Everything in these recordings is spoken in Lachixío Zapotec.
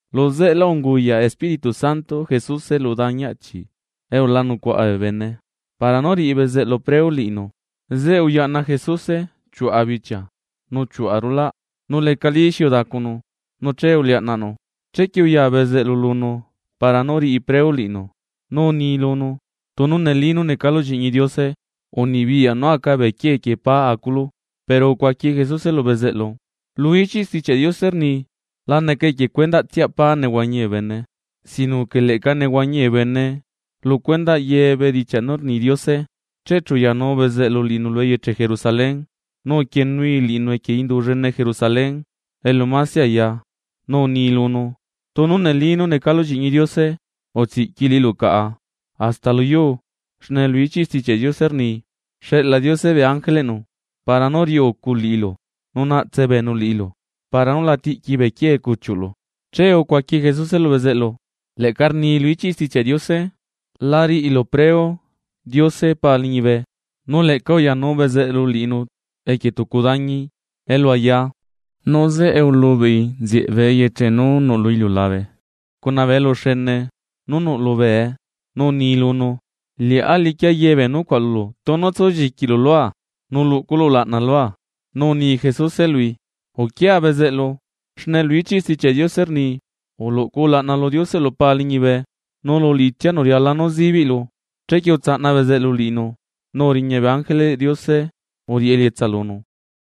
Luzeꞌelá unguyaꞌ Espíritu Santo Jesuse lu dañi achi elu la nucuaꞌa bee bene para nú riꞌi bezeꞌlu preu liꞌinu. Zeꞌe uyaꞌna Jesuse chiuꞌa bichia nu chiuꞌa rulaꞌ nu lecalí xi udacunu nu che uliaꞌnaꞌnu. Chequie uya bezeꞌlu lunu para nú riꞌi preu liꞌinu nu uni lunu: ―Tunu neli nú necalu lliꞌñi Diose, unibiyaꞌ nú aca bee quiee quieꞌ pá aculu. Pero ucuaqui Jesuse lu bezeꞌlu: ―Lu ichiꞌ Stichiaꞌ Diose rni: “La neca equie cuendaꞌtsia pá nehuañi bee bene, sino que leꞌca nehuañi bee bene lu cuendaꞌ ye bedichiaꞌ nú rni Diose.” Che chu uyanu bezeꞌlu liꞌinu eyeche Jerusalén nu uquienui liꞌinu equie indu llene Jerusalén elu mase aya, nu uni lunu: ―Tunu neli nú necalu lliꞌñi Diose, utsiꞌqui liꞌilu caꞌa hasta lu yuu, xne lu ichiꞌ Stichiaꞌ Diose rni: Xeꞌla Diose bee ángeleꞌnu para nú riꞌi ucu liꞌilu. Nu naꞌtse beenu liꞌilu para nú la tiꞌqui bee quiee cuchiuꞌlu. Che ucuaqui Jesuse lu bezeꞌlu: ―Leꞌca rni lu ichiꞌ Stichiaꞌ Diose: “La riꞌilu preu Diose Pa liñibe.” Nu leꞌca uyanu bezeꞌlu liꞌinu equie tucu dañi elu aya, nu zeꞌe ulubeꞌi lunu nzieꞌ bee eyeche nú nuꞌ lu iliulabe cuna bee eluxene nú nuꞌ lubee, nu uni lunu: ―Liꞌá liquia ye bee nucuaꞌ lulu, tunu tsulliquilu lua nu luꞌculu ulaꞌna lua. Nu uni Jesuse lui: ―Uquia bezeꞌlu, xne lu ichiꞌ Stichiaꞌ Diose rni: “Uluꞌcu ulaꞌna lu Dioseꞌlu Pa liñibe, nu lu liꞌitsianu riala nú zibiꞌlu.” Chequie utsaꞌna bezeꞌlu liꞌinu, nu uriña bee ángeleꞌ Diose uriꞌi elietsa lunu.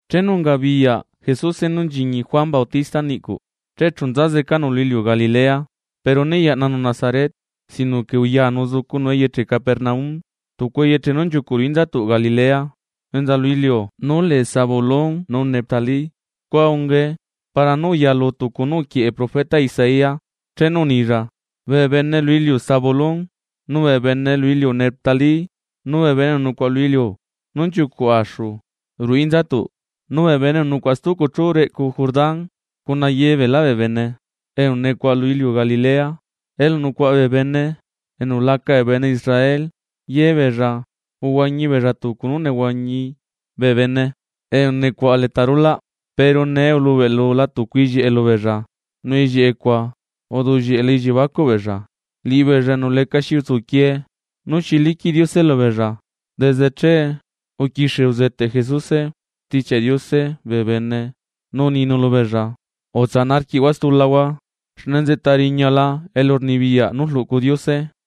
Chenu ungabiyaꞌ Jesuse nú nchiñi Juan Bautista niꞌcuꞌ, che chu nzazecanu lu iliu Galilea. Pero né yaꞌnanu Nazaret, sino que uyanu uzucunu eyeche Capernaum, tucu eyeche nú nchiucuꞌ ruꞌu inzatuꞌ Galilea enza lu iliu nú lee Zabulón nu Neftalí. Scua ungae para nú uyalu tucu nú uquieꞌe profeta Isaías chenu unilla: Bee bene lu iliu Zabulón nu bee bene lu iliu Neftalí, nu bee bene enu nucuaꞌa lu iliu nú nchiucuꞌ axu reꞌcu Jordán, cuna ye beelá bee bene enu nucuaꞌa axu ru'u inzatu' lu iliu Galilea elu nucuaꞌa bee bene enu laca bee bene Israel. Ye beella uhuañi beella tucu nú nehuañi bee bene enu nucuaꞌa leta rulaꞌ, pero nee ulubeꞌlula tucu ellieꞌe lubeella, nu ellieꞌe cuaꞌ uduꞌllieꞌe lu elliebacuꞌ beella, liꞌibeella enu lecaxi utsuquie nú xi liquiꞌ Diose lubeella. Desde che uquixie uzeteꞌ Jesuse Stichiaꞌ Diose bee bene nu uninu lubeella: ―Tsanaꞌ arquiꞌhua stulahua xne nzeꞌta riñala elurnibiyaꞌ nú rluꞌcu Diose.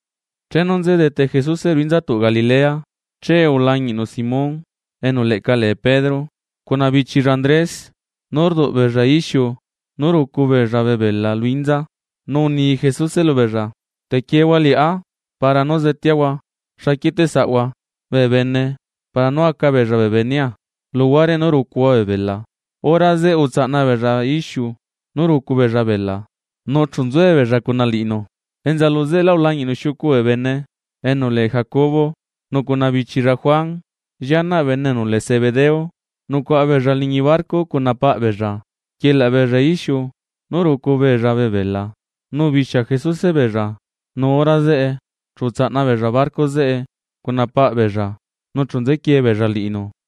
Chenu nzedete Jesuse ruꞌu inzatuꞌ Galilea, che ulañiꞌnu Simón, enu leꞌca lee Pedro, cuna bichilla Andrés, nú rduꞌbeella ixiu nú rucu beella bee bela lu inza. Nu uni Jesuse lubeella: ―Te quiehua liꞌá para nú zeteahua xa quieteꞌsaꞌhua bee bene para nú aca beella bee benea luguare nú rucuhua bee bela. Hora zeꞌe utsaꞌna beella ixiu nú rucu beella bela nu chu nzuebeella cuna liꞌinu. Enza luzeꞌelá ulañiꞌnu xiucu bee bene, Jacobo nu cuna bichilla Juan, llianaꞌ bene enu lee Zebedeo. Nucuaꞌa beella liñi barco cuna paꞌ beella, rquielaꞌ beella ixiu nú rucu beella bee bela. Nu ubixia Jesuse beella, nu hora zeꞌe chu utsaꞌna beella barco zeꞌe cuna saꞌbeella, nu chu nzequie beella liꞌinu.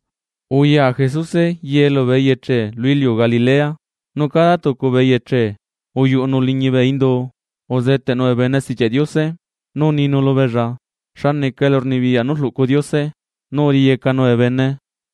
Uya Jesuse ye lubee eyeche lu iliu Galilea, nu cada tucu bee eyeche uyuꞌunu liñi bee indu uzeteꞌnu bee bene Stichiaꞌ Diose, nu uninu lubeella xa neca elurnibiyaꞌ nú rluꞌcu Diose nu uriyecanu bee bene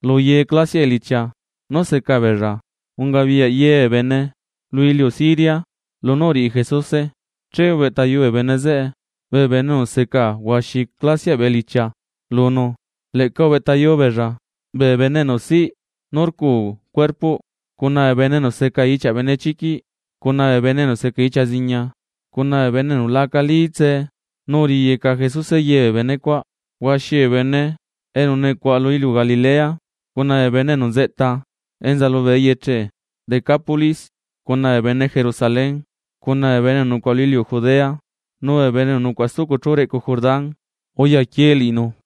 luye clasiaꞌ elichia nú seca beella. Ungabiyaꞌ ye bee bene lu iliu Siria lunú uriꞌi Jesuse, che ubeꞌtayu bee bene zeꞌe bee bene enu seca huaxi clasiaꞌ bee elichia lunu, leꞌca ubeꞌtayu beella bee bene enu siꞌ nú rcu cuerpoꞌ, cuna bee bene enu seca ichiaꞌ benechiquiꞌ, cuna bee bene enu seca ichia ziña cuna bee bene enu la acalí tsee nu uriyeca Jesuse ye bee bene cuaꞌ. Huaxi bee bene enu nucuaꞌa lu iliu Galilea, cuna bee bene enu nzeꞌta enza lubee eyeche Decápolis, cuna bee bene Jerusalén cuna bee bene enu nucuaꞌa lu iliu Judea nu bee bene enu nucuaꞌa stucu chú reꞌcu Jordán, uyaquie liꞌinu.